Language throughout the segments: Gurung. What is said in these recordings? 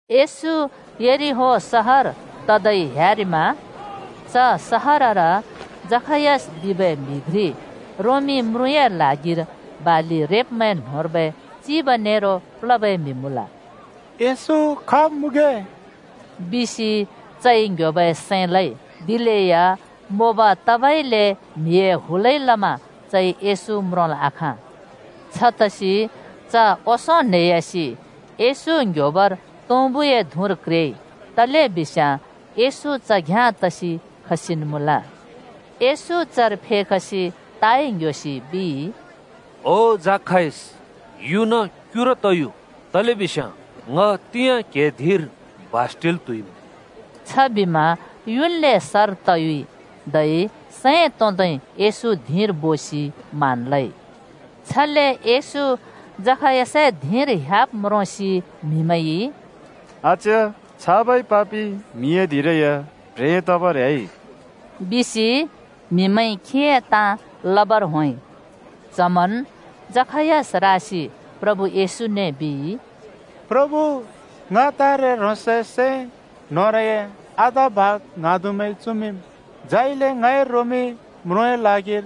येशू यरिहो सहर तदै ह्‍यारिमा। च सहरर जखायस बिबै म्‍हि घ्रि रोमी म्रुँए ल्हागिर बालि रेब्‍मैं न्‍होंर्बै चिब नेरो प्लबै म्हि मुँल। “येशू खाब् मुँगे” बिसि चइ ङ्‌‍ह्‍योबै सैं लइ। दिलेया मोब तबइले म्‍हिए हुलइ लमा चइ येशू म्रोंल् आखाँ। छतसि च ओंसों न्हेयासि येशू ङ्ह्‍योबर तुँबुए धुँर क्रेइ। तलेबिस्याँ येशू च घ्‍याँ तसि खसिन् मुँल। येशू चर फेखसि ताइ ङ्‌‍ह्‍योसि बिइ, “ओ जखायस, युना क्युरु तयु, तलेबिस्याँ ङ तिंयाँ क्‍हिए धिंर बास टिल् त्‍हुइमुँ।” छबिमा च युन्ले सर तयुइ। धै सैं तोंदै येशू धिंर बोसि मान लइ। छले येशू जखायसए धिंर ह्‍याब् म्रोंसि “अच्‍या छाबै पापि म्हिए धिंरै या प्ह्रें तबर ह्‍याइ बिसि म्हिमैंइ खीए ताँ लबर होंइ।” च्हमन् जखायस रासि प्रभु येशूने बिइ, “प्रभु, ङ तारे ह्रोंसए सै न्होरए आधा भाग ङ्हाँदुमैं चुमिंम्। झाइले ङइ रोमी म्रुँए ल्हागिर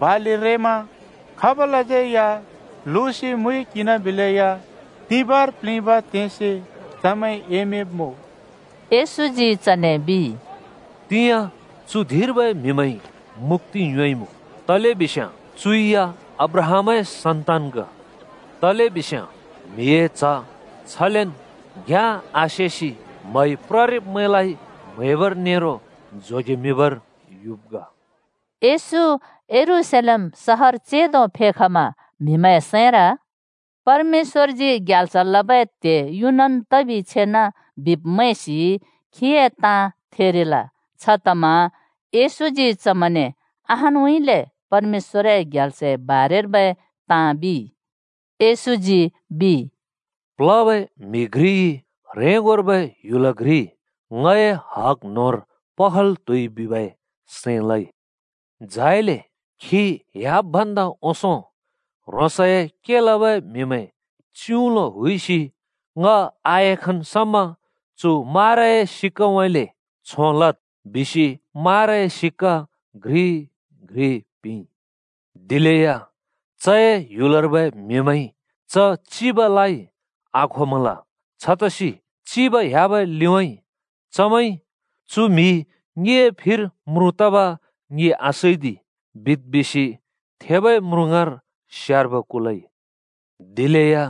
बालि रेमा खाबलाज्यै या लुसि मुइ किंना बिलेया तिबाँर प्लिबाँ तेंसि चमैं एमिंब्‍मुँ।” येशूजी चने बिइ, “तिंयाँ चु धिंर्बै म्हिमैंइ मुक्‍ति योंइमुँ, तलेबिस्याँ चु या अब्राहामए सन्तान ग। तलेबिस्याँ म्हिए च्ह छलेन् घ्याँ आसेसि म्हप्ररिब्मैंलाइ म्हैबर नेरो जोगेमिंबर युब् ग।” येशू यरूशलेम सहर चेंदो फेख‍मा म्‍हिमैंए सैंर “परमेश्‍वरजी ग्याल्स लबै त्‍हे युनन् तबि छेना बिब् मैंसि खीए ताँ थेरिल। छतमा येशूजी चमैंने परमेश्‍वरए ग्याल्सए बारेर्बै ताँ अहानउँइँले बिइ।” येशूजी बिइ, “प्लबै म्हि घ्रिइ ह्रेंगोर्बै ह्‍युल घ्रि ङए हग न्होंर पखल त्हुइ बिबै सैं लइ। झाइले खी ह्‍याब् भन्दा ओंसों ह्रोंसए के लबै म्हिमैं च्‍युउलो हुइसि ‘ङ आएखन् समा चु माराए सिक्‍काउँइँले छों लद्,’ बिसि माराए सिक्‍का घ्रि घ्रि पिंइ। “दिलेया चए ह्‍‍युलर्बै म्हिमैंइ च चिबलाइ आखोमल। छतसि चिब ह्‍याबै लिउँइँ ‘चु म्‍हि ङिए फिर म्रुँ तब ङि आसैदि,’ बिद् बिसि थेबै म्रुँ ङाँर चमैंइ स्यार्बो कुलइ। “दिलेया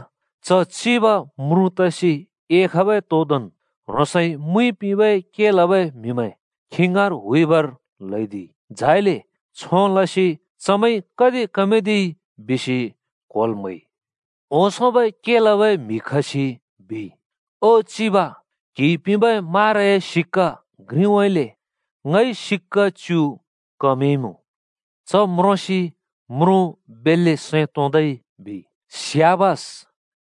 च चिब म्रुँ तसि एखबै तोदोंन् ह्रोंसइ मुइ पिंथेंबै के लबै म्हिमैं खी ङाँर हुइबर ल्हैदिइ। झाइले छों लसि चमैंइ कति कमदिइ बिसि क्होल् म्हैइ। ओंसोंबै के लबै म्हि खसि बिइ, ‘ओ चिब, क्‍हिइ पिंबै माराए सिक्‍का घ्रिउँइँले ङइ सिक्‍का च्‍यु कमदिइमुँ।’ “च म्रोंसि म्रुँ बेल्‍ले सैं तोंदै बिइ, ‘स्‍याबास!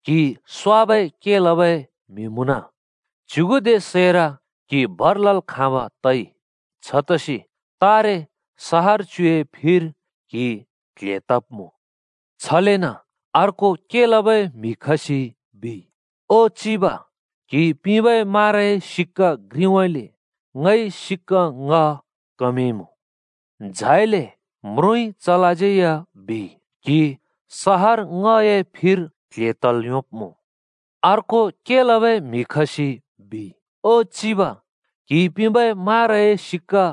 क्‍हि स्‍वाबै के लबै म्हि मुँन! च्‍युगुदे सैर क्‍हि भर लल् खाँब तइ। छतसि तारे सहर च्‍युए फिर क्हि क्ल्हे तब्मुँ।’ “छलेन अर्को के लबै म्हि खसि बिइ, ‘ओ चिब, क्‍हिइ पिंबै माराए सिक्‍का घ्रिउँइँले ङइ सिक्‍का ङ्‍ह कमदिइमुँ।’ “झाइले म्रुँइ चलाज्यै या बिइ, ‘क्‍हि सहर ङ्‍हए फिर क्ल्हे तल् योंब्मुँ।’ “अर्को के लबै म्हि खसि बिइ, ‘ओ चिब, क्‍हिइ पिंबै माराए सिक्‍का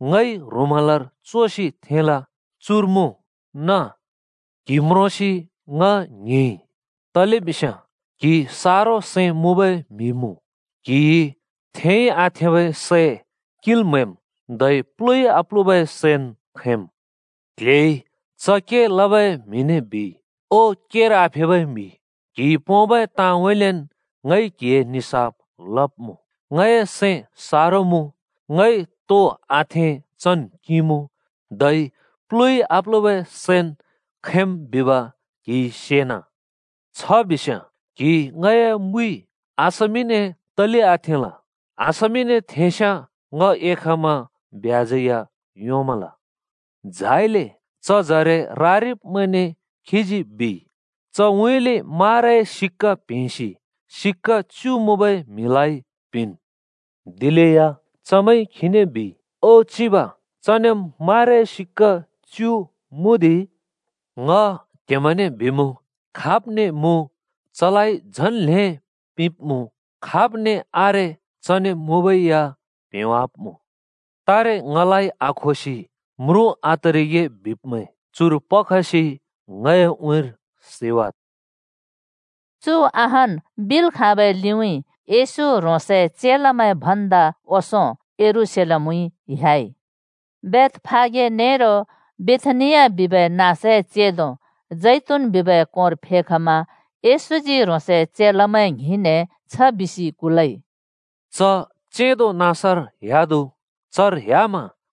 ङइ ह्रुमालर चोसि थेंल। चुर मुँ नाँ बिइ। क्‍हि म्रोंसि ङ ङ्हिंइ, तलेबिस्याँ क्हि सारो सैं मुँबै म्हि मुँ। क्हिइ थेंइ आथेंबै सै किंल् म्हैम्, धै प्लुइ आप्‍लुबै सैन् खैंम्।’ “क्ल्हेइ च के लबै म्हिने बिइ, ‘ओ, केर आफेबै म्हि! क्‍हिइ पोंबै ताँउँइँलेन् ङइ क्हिए निसाफ लब्मुँ। ङए सैं सारो मुँ, ङइ थेंइ आथेंबै सैन् किंमुँ, धै प्लुइ आप्‍लुबै सैन् खैंम् बिब क्‍हिइ सेना। छ बिस्‍याँ क्‍हिइ ङए मुइ बेङ्गर तले आथेंल? बेङ्गर थेंस्‍याँ ङ एखमा ब्याजै योंमल।’ झाइले च जरे रारिब्‍मैंने खीजी बिइ, ‘चउँइँले माराए सिक्‍का प्‍हेंसि सिक्‍का च्‍यु मुँबै म्हिलाइ पिंवान्।’ “दिलेया च‍मैंइ खीने बिइ, ‘ओ चिब चनेम् माराए सिक्‍का च्‍यु मुँदि!’ “ङ क्हेमैंने बिमुँ, खाब्ने मुँ चलाइ झन् ल्हें पिंब्‍मुँ। खाब्ने आरे चने मुँबै या प्‍हेंवाब्‍मुँ। तारे ङलाइ आखोसि ‘म्रुँ आतरिगे’ बिब्‍मैं चुर पखसि ङए उँइँर सैवाद्।” चु अहान् बिल् खाँबै लिउँइँ येशू ह्रोंसए चेलामैं भन्दा ओंसों यरूशलेमउँइँ ह्‍याइ। बेथफागे नेरो बेथानिया बिबै नाँसए चेंदो जैतून बिबै कोंर फेखमा येशूजी ह्रोंसए चेलामैं ङ्हिंने छ बिसि कुलइ, “च चेंदोबै नाँसर ह्‍यादु। चर ह्‍याम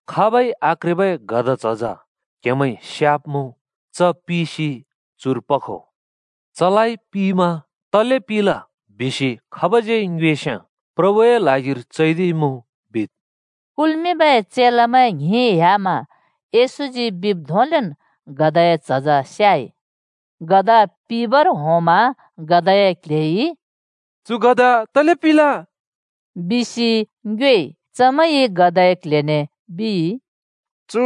खाबै आक्रेबै गधा झज च्युँइँथेंब क्‍हेमैंइ स्‍याब्‍मुँ। च पिसि चुर पखो। चलाइ पिमा ‘तले पिल?’ बिसि खाबज्‍यै ङ्योस्याँ ‘प्रभुए ल्हागिर चैदिइमुँ,’ बिद्।” कुल्मिंबै चेलामैं ङ्हिं ह्‍यामा येशूजी बिब् धोंलेन् गधाए झज स्‍याइ। गधा पिबर होंमा गधाए क्‍ल्‍हेइ “चु गधा तले पिल?” बिसि ङ्योएइ। चमैंइ गधाए क्ल्हेने बिइ, “चु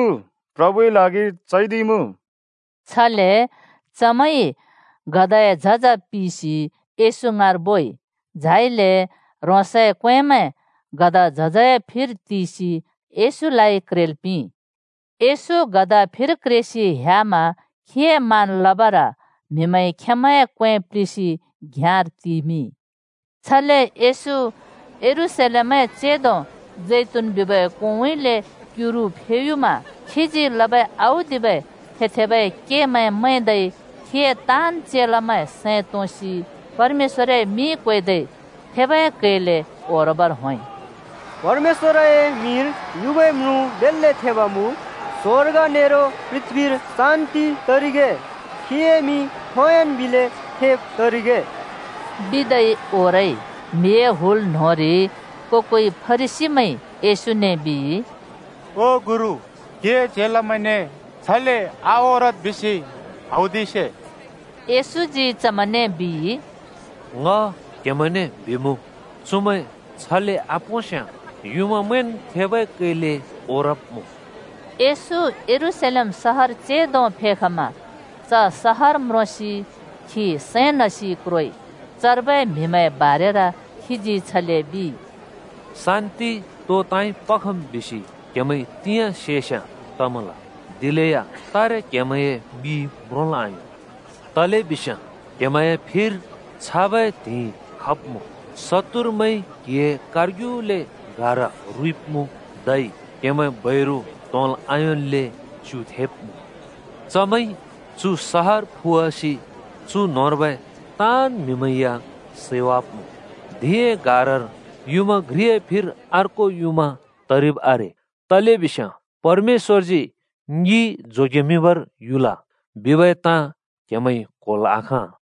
प्रभुए ल्हागिर चैदिइमुँ।” छले चमैंइ गधाए झज पिसि येशू ङाँर बोइ। झाइले ह्रोंसए क्‍वेंमैं गधा झजए फिर तिसि येशूलाइ क्रेल् पिंइ। येशू गधा फिर क्रेसि ह्‍यामा खीए मान लबर म्हिमैंइ खेंमैंए क्‍वें प्‍लिसि घ्‍याँर तिमिंइ। छले येशू यरूशलेमए चेंदो मुँबै जैतून बिबै कोंउँइँले क्युरु फेयुमा खीजी लबै औदिबै थे-थेबै केमैं मैंदै खीए ताँन् चेलामैं सैं तोंसि परमेश्‍वरए मिं क्वेदै थेबै कैले ओरबर होंइ। “परमेश्‍वए मिंर युबै म्रुँ बेल्‍ले थेब मुँ। स्वर्ग नेरो पृथ्‍बीर शान्ति तरिगे। खीए मिं खोंयोंन् बिले थेब् तरिगे,” बिदै ओरइ। म्‍हिए हुल न्‍होंरि को-कोइ फरिसीमैंइ येशूने बिइ, “ओ गुरु, क्‍हिए चेलामैंने ‘छले आओरद्’ बिसि हौदिसे।” येशूजी चमैंने बिइ, “ङ क्हेमैंने बिमुँ, चुमैं छले आपोंस्‍याँ युँमामैंन् थेबै कैले ओरब्मुँ।” येशू यरूशलेम सहर चेंदो फेखमा। च सहर म्रोंसि खी सैं नसि क्रोइ। चर्बै म्‍हिमैंए बारेर खीजी छले बिइ, “शान्‍ति तो ताँइ पखम् बिसि क्‍हेमैंइ तिंयाँ सेस्‍याँ तमल! दिलेया तारे क्‍हेमैंए मिइ म्रोंल् आयों। तलेबिस्याँ क्हेमैंए फिर छाबै त्हिंइ खब्मुँ: शत्तुरमैंइ क्हिए कारग्युले गारा रुइब्मुँ धै क्हेमैं बैरु त्होंल् आयोंन्ले च्युथेंब्‍मुँ। चमैंइ चु सहर फुवासि चु न्‍होंर्बै ताँन् म्‍हिमैं या सैवाब्‍मुँ। धिंए गारार युँमा घ्रिए फिर अर्को युँमा तरिब् आरे। तलेबिस्याँ ‘ङिं जोगेमिंबर परमेश्‍वर युल!’ बिबै ताँ क्हेमैंइ क्होल् आखाँल।”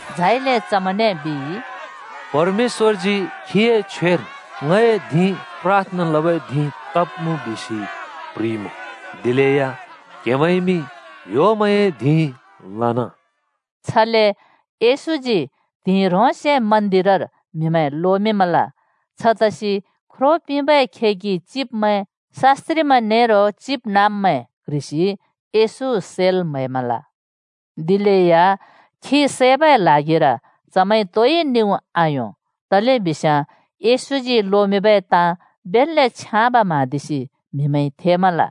झाइले चमैंने बिइ, “परमेश्‍वरजी खीए छ्वेर ‘ङए धिं प्राथना लबै धिं तब्‍मुँ,’ बिसि प्‍ह्रिइमुँ, दिलेया क्‍हेमैंइमि ह्‍योमैंए धिं लना।” छले येशूजी त्हिंइ ह्रोंसे मन्दिरर म्हिमैं लोमिंमल। छतसि ख्रो पिंबै खेगि चिब्मैं, शास्‍त्रिमैं नेरो चिबनाँब्मैं क्ह्रिसि येशू सैल् म्‍हैमल। दिलेया खी सैबै ल्हागिर चमैंइ तोइ निउँ आयों। तलेबिस्याँ येशूजी लोमिंबै ताँ बेल्‍ले छ्याँब म्हाँदिसि म्हिमैंइ थेमल।